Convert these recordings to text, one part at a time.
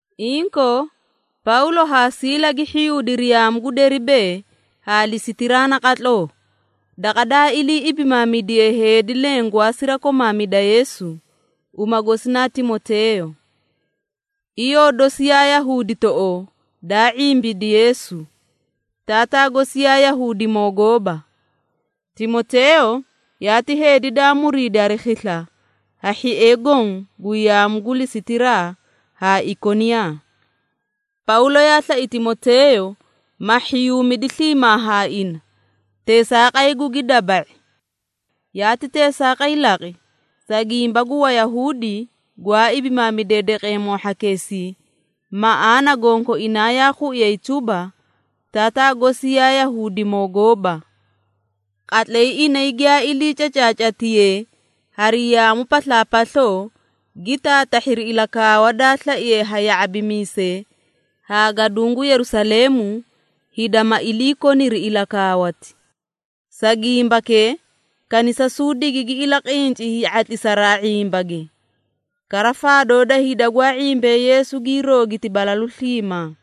Inkoo, Pawlo haa Siila gi hhiyuudiri yaamu gu Deribee haa Lisitiraa naqatloo, daqa daa ilii ibimaamidiye heedi leẽ gwaa sirakomaamida Yeesu, uma gosi naa Timoteeyo. Iyoo dosi yaa Yahuuditoꞌoo daa ⁄imbidi Yeesu, taataa gosi yaa Yahuudimoo gooba. Timoteeyo yaati heedi daa muriidi hari khisla ha hhiee goõ gu yaamu gu Lisitiraa haa Ikoniyaa. Pawlo yaa slai Timoteeyo ma hhiyuumidi sliimaa haa ina, teesaaqay gugi daba⁄i. Yaati teesaaqay laqi, sa gimba gu Wayahuudi gwaa ibimaamidee daqeemoo hhakeesii, maꞌaana gonkoinaa yaa khuiyay tuba, taataa gosi yaa Yahuudimoo gooba. Qatlay inay giyaa ilii cacaacatiyee hari yaamu paslaapasloo, gi taatahhiri ilakaawa daa slaiye ha ya⁄abimiisee haa gaduũ gu Yerusaleemu, hida ma iliikoniri ilakaawati. Sa gimbakee kanisasuu digigi ilaqinci hii⁄atlisaraa ⁄imbage, kara faadoo da hida gwaa ⁄imbee Yeesu gii roogiti balalu sliimaa.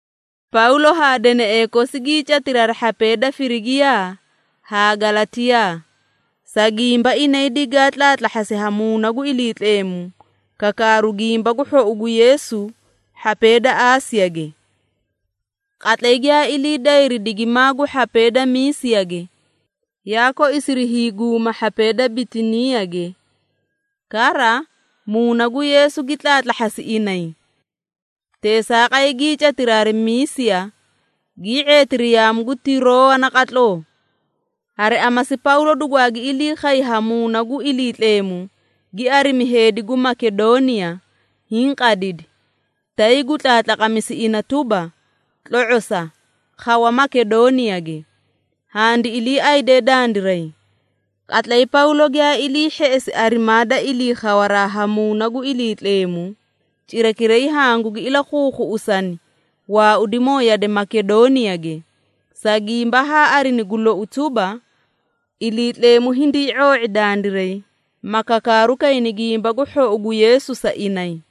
Pawlo haa deneꞌee kosi gii catiri hari hhapee da Firigiiya haa Galatiyaa, sa gimba inay digaa tlaatlahhasi ha Muuna gu Iliitleemu kakaaru Gimba gu Hhou gu Yeesu hhapee da Aasiyage. Qatlay giyaa ilii dayri digimaa gu hhapee da Miisiyage, yaa koisiri hiiguuma hhapee da Bitiniiyage. Kara, Muuna gu Yeesu gi tlaatlahhasi inay. Teesaaqay gii catiri hari Miisiya, gii ⁄eetiri yaamu gu Tiroowa naqatloo. Hari amasi Pawlo dugwaagi ilii khay ha Muuna gu Iliitleemu, gi arimi heedi gu Makedooniya hiĩ qadidi, tay gu tlaatlaqamisi ina tuba, “Tlo⁄osa, khawa Makedooniyage, handi iliiayde dandiray.” Qatlay Pawlo giyaa ilii hheꞌesi arimaa da ilii khawaraa ha Muuna gu Iliitleemu, cirakiray hangugi ilakhuukhuꞌusani waaudimoo yade Makedooniyage, sa gimba haa arini gu lou tuba, Iliitleemu hindii ⁄oo⁄i dandiray, ma kakaaru kayni Gimba gu Hhou gu Yeesu sa inay.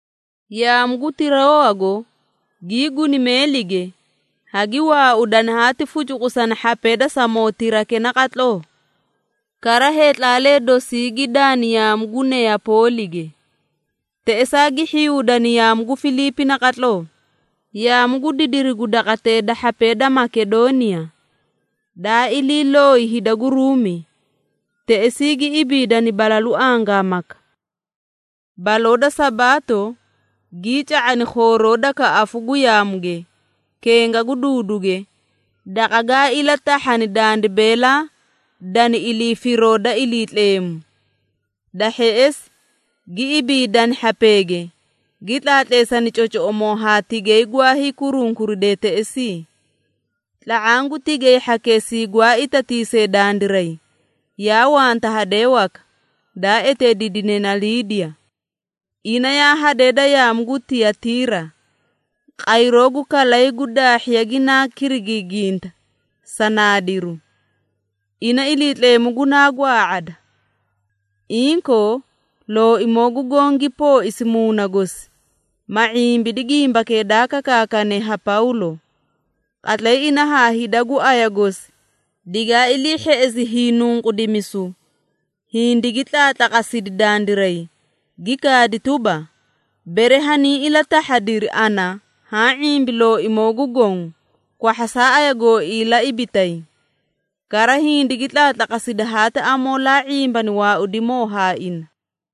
Yaamu gu Tiroowago gii guni meelige, hagi waaudani haati fucukusani hhapee da Samootirake naqatloo. Kara heetlaalee dosii gi daani yaamu gu Neyapoolige. Teꞌesaa gi hhiyuudani yaamu gu Filiipi naqatloo, yaamu gu didiri gu daqatee da hhapee da Makedooniya, daa ilii looyi hida gu Ruumi. Teꞌesii gi ibiidani balalu angaamaka. Baloo da Sabaato gii ca⁄ani khooroo da kaꞌafu gu yaamuge, kenga gu duuduge, daqa gaa ilatahhani dandi beelaa dani ilii firoo da Iliitleemu. Da hheꞌesi gi ibiidani hhapeege, gi tlaatleesani cocoꞌomoo haa tigay gwa hiikurunkuridee teꞌesii. Tla⁄aã gu tigay hhakeesii gwaa itatiisee dandiray, yaa wanta hadee waka, daa eteediidine naa Liidiya. Ina yaa hadee da yaamu gu Tiyatiira, qayroo gu kalay gu daahhiya ginaa kirigiiginta sa naadiru. Ina Iliitleemu gunaa gwaa⁄ada. Inkoo Looimoo gu Goõ gi pooisi muuna gosi, ma ⁄imbidi gimbakee daa kakaakane ha Pawlo. Qatlay ina haa hida gu aya gosi digaa ilii hheꞌesi hiinunqudimisu, hindigi tlaatlaqasidi dandiray, gi kaadi tuba, “Bere hanii ilatahhadiri ana haã ⁄imbi Looimoo gu Goõ, kwahhasaa aya gooii la ibitay.” Kara hindigi tlaatlaqasidi haati amoolee ⁄imbani waaudimoo haa ina.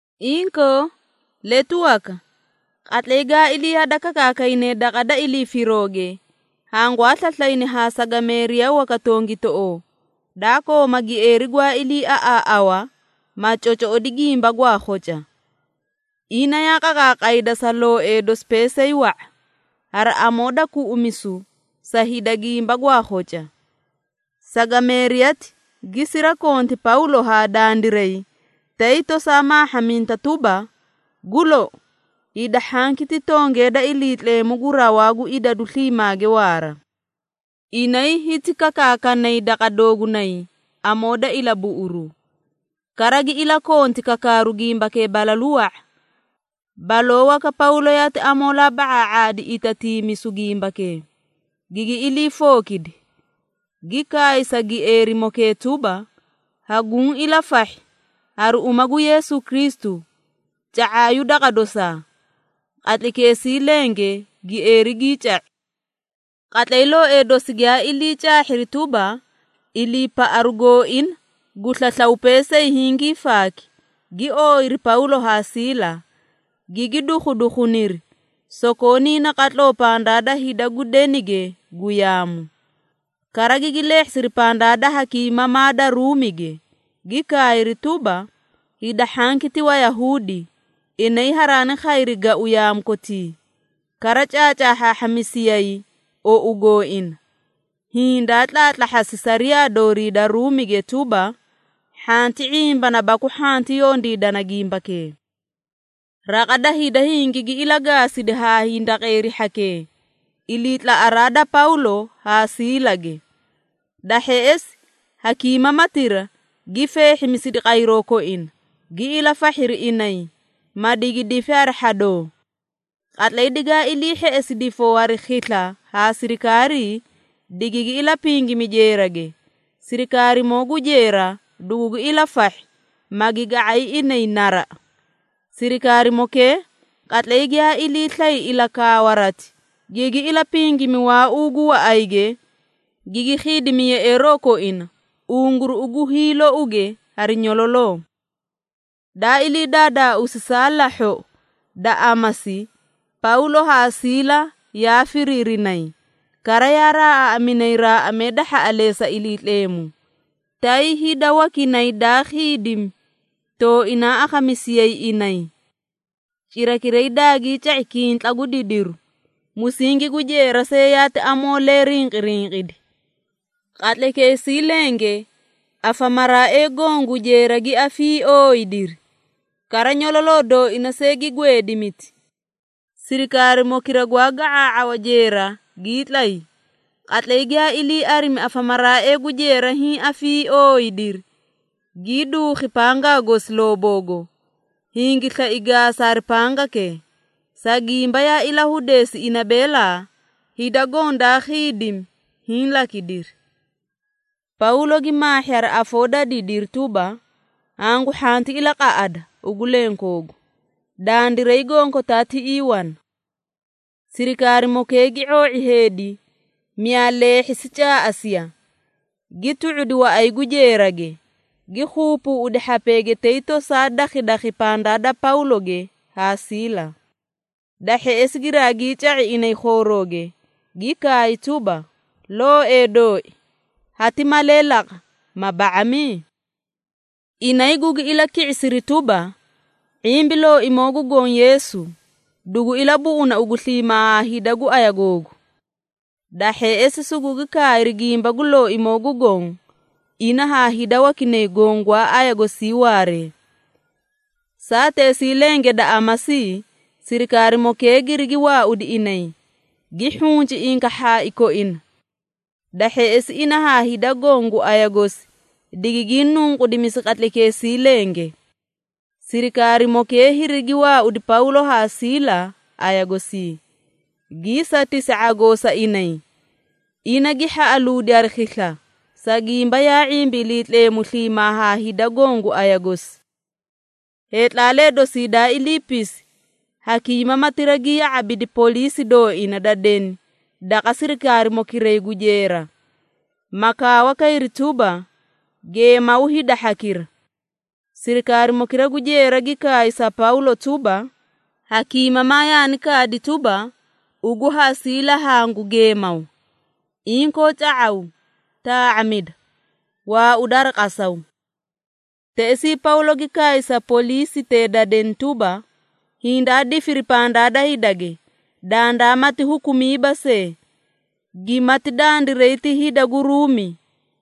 Inkoo, letu waka, qatlay gaa ilii hadakakaakayne daqa da ilii firooge, hangwaa slaslayni haa sagameeriya waka tongitoꞌoo, daa kooma gieeri gwaa iliiaꞌaaꞌawa, ma cocoꞌodi gimba gwaa khoca. Ina yaa qaqaaqayda sa looee dosi peesay wa⁄a, hari amoo da kuꞌumisu sa hida gimba gwaa khoca. Sagameeriyati gi sirakonti Pawlo haa dandiray, tay tosaa maahhaminta tuba, “Gu lou, hida hhanki ti tongee da Iliitleemu gu Rawaa gu Idadu Sliimaage Waara. Inay hiti kakaakanay daqa doogunay amoo da ilabuꞌuru.” Kara gi ilakonti kakaaru gimbakee balalu wa⁄a. Baloo waka Pawlo yaati amoolaa ba⁄aa⁄aadi itatiimisu gimbakee, gigi ilii fookidi, gi kaay sa gieerimokee tuba, “Haguũ ilafahhi hari uma gu Yeesu Kristu, ca⁄aayu daqa dosaa!” Qatlaykeesii lenge gieeri gii ca⁄i. Qatlay looee dosi giyaa ilii caahhiri tuba, iliipaꞌaru gooina gu slaslaw peesay hingii faaki, gi ooyiri Pawlo haa Siila, gigi dukhudukhuniri sokoonii naqatloo pandaa da hida gu denige gu yaamu. Kara gigi leehhisiri pandaa da hakiimamaa da Ruumige, gi kaayri tuba, “Hida hhanki ti Wayahuudi, inay haraani khayri gau yaamu kotii, kara caacaahhaahhamisiyay ou gooina, hiĩ daa tlaatlahhasi sariyaa doorii da Ruumige tuba, hhanti ⁄imbana baku hhanti yondiidana gimbakee.” Raqa da hida hingigi ilagaasidi haa hindaqeeri hhakee, iliitlaꞌaraa da Pawlo haa Siilage. Da hheꞌesi hakiimamatira gi feehhimisidi qayroo koina, gi ilafahhiri inay, ma digi difi hari hhadoo. Qatlay digaa ilii hheꞌesi difoo hari khisla ha sirikaarii, digigi ilapingimi jeerage, sirikaarimoo gu jeera dugugi ilafahhi, magi ga⁄ay inay naraꞌa. Sirikaarimokee qatlay giyaa ilii slay ilakaawarati, gigi ilapingimi waauu gu waꞌayge, gigi khiidimi yeꞌeeroo koina unguruꞌu gu hiilouge hari nyololoo. Daa ilii daadaausi saa lahhoꞌo da amasi Pawlo haa Siila yaa firiirinay, kara yaa raaꞌaaꞌaminay raaꞌamee da hhaꞌaleesa Iliitleemu, tay hida wakinay daa khiidimi tooinaa akhamisiyayi inay. Cirakiray daagii ca⁄i kintla gu didiru, musingi gu jeera see yaati amoolee rinqirinqidi. Qatlaykeesii lenge afamaraaee goõ gu jeera gi afiiooyidiri, kara nyololoo dooina see gi gweedimiti. Sirikaarimokira gwaa ga⁄aa⁄awa jeera gii tlay, qatlay giyaa ilii arimi afamaraaee gu jeera hiĩ afiiooyidiri, gii duukhi pangaa gosi looboogo, hingi slai gaasa hari pangakee, sa gimba yaa ilahudeesi ina beelaa, hida goõ daa khiidimi hiĩ lakidiri. Pawlo gi maahhi hari afoo da didiri tuba, “Hangu hhanti ilaqaꞌada ugu lenkoogu! Dandiray gonkotaa tiꞌii wana.” Sirikaarimokee gi ⁄oo⁄i heedi, miyaa leehhisi caaꞌasiya, gi tu⁄udi waꞌay gu jeerage, gi keebeeꞌedi hhapeege tay tosaa dakhidakhi pandaa da Pawloge haa Siila. Da hheꞌesi giraagii ca⁄i inay khoorooge, gi kaay tuba, “Looee dooi, hati malee laqa, ma ba⁄ami?” Inay gugi ilaki⁄isiri tuba, “⁄imbi Looimoo gu Goõ Yeesu, dugu ilabuꞌuna ugu sliimaa haa hida gu aya googu.” Da hheꞌesi sugugi kaayri Gimba gu Looimoo gu Goõ, ina haa hida wakinay goõ gwaa aya gosii waaree. Saateesii lenge da amasii, sirikaarimokee girigi waaudi inay, gi hhunci inkaahhaai koina. Da hheꞌesi ina haa hida goõ gu aya gosi digigii nunqudimisi qatlaykeesii lenge. Sirikaarimokee hirigi waaudi Pawlo haa Siila aya gosii, gii satisi ⁄agoo sa inay, ina gi hhaꞌaluudi hari khisla, sa gimba yaa ⁄imbi Iliitleemu sliimaa haa hida goõ gu aya gosi. Heetlaalee dosii daa iliipisi, hakiimamatira gi ya⁄abidi poliisi dooina da deni daqa sirikaarimokiray gu jeera, ma kaawa kayri tuba, “Geemaw hida hhakira.” Sirikaarimokira gu jeera gi kaay sa Pawlo tuba, “Hakiimamaa yaani kaadi tuba, ugu haa Siila hangu geemaw. Inkoo ca⁄aw, taa⁄amida. Waauda hari qasaw.” Teꞌesii Pawlo gi kaay sa poliisitee da deni tuba, “Hindaa difiri pandaa da hidage, dandaamati hukumiiba see, gimati dandiray ti hida gu Ruumi,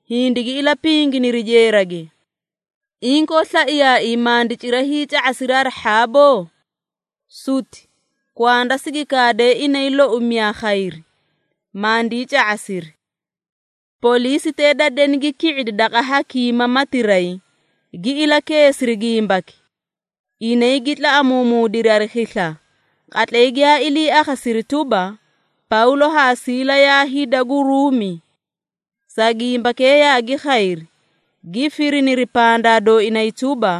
hindigi ilapinginiri jeerage. Inkoo slaiyaaii, mandi cira hiica⁄asiri hari hhaaboo?” Suti! Kwanda sigi kaade inay loi miyaa khayri, mandii ca⁄asiri. Poliisitee da deni gi ki⁄idi daqa hakiimamatiray, gi ilakeesiri gimbaki. Inay gi tlaꞌamuumuudiri hari khisla, qatlay giyaa ilii akhasiri tuba, Pawlo haa Siila yaa hida gu Ruumi. Sa gimbakee yaagi khayri, gi firiniri pandaa dooinay tuba,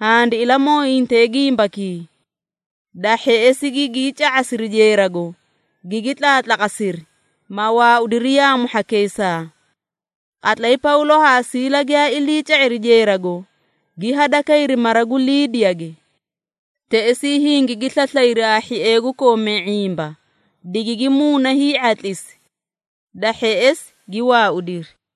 “Handi ilamooyinte gimbakii.” Da hheꞌesi gigii ca⁄asiri jeerago, gigi tlaatlaqasiri, ma waaudiri yaamu hhakeesaa. Qatlay Pawlo haa Siila giyaa ilii ca⁄iri jeerago, gi hadakayri mara gu Liidiyage. Teꞌesii hingigi slaslayri haa hhiee gu koomee ⁄imba, digigi muuna hii⁄atlisi. Da hheꞌesi gi waaudiri.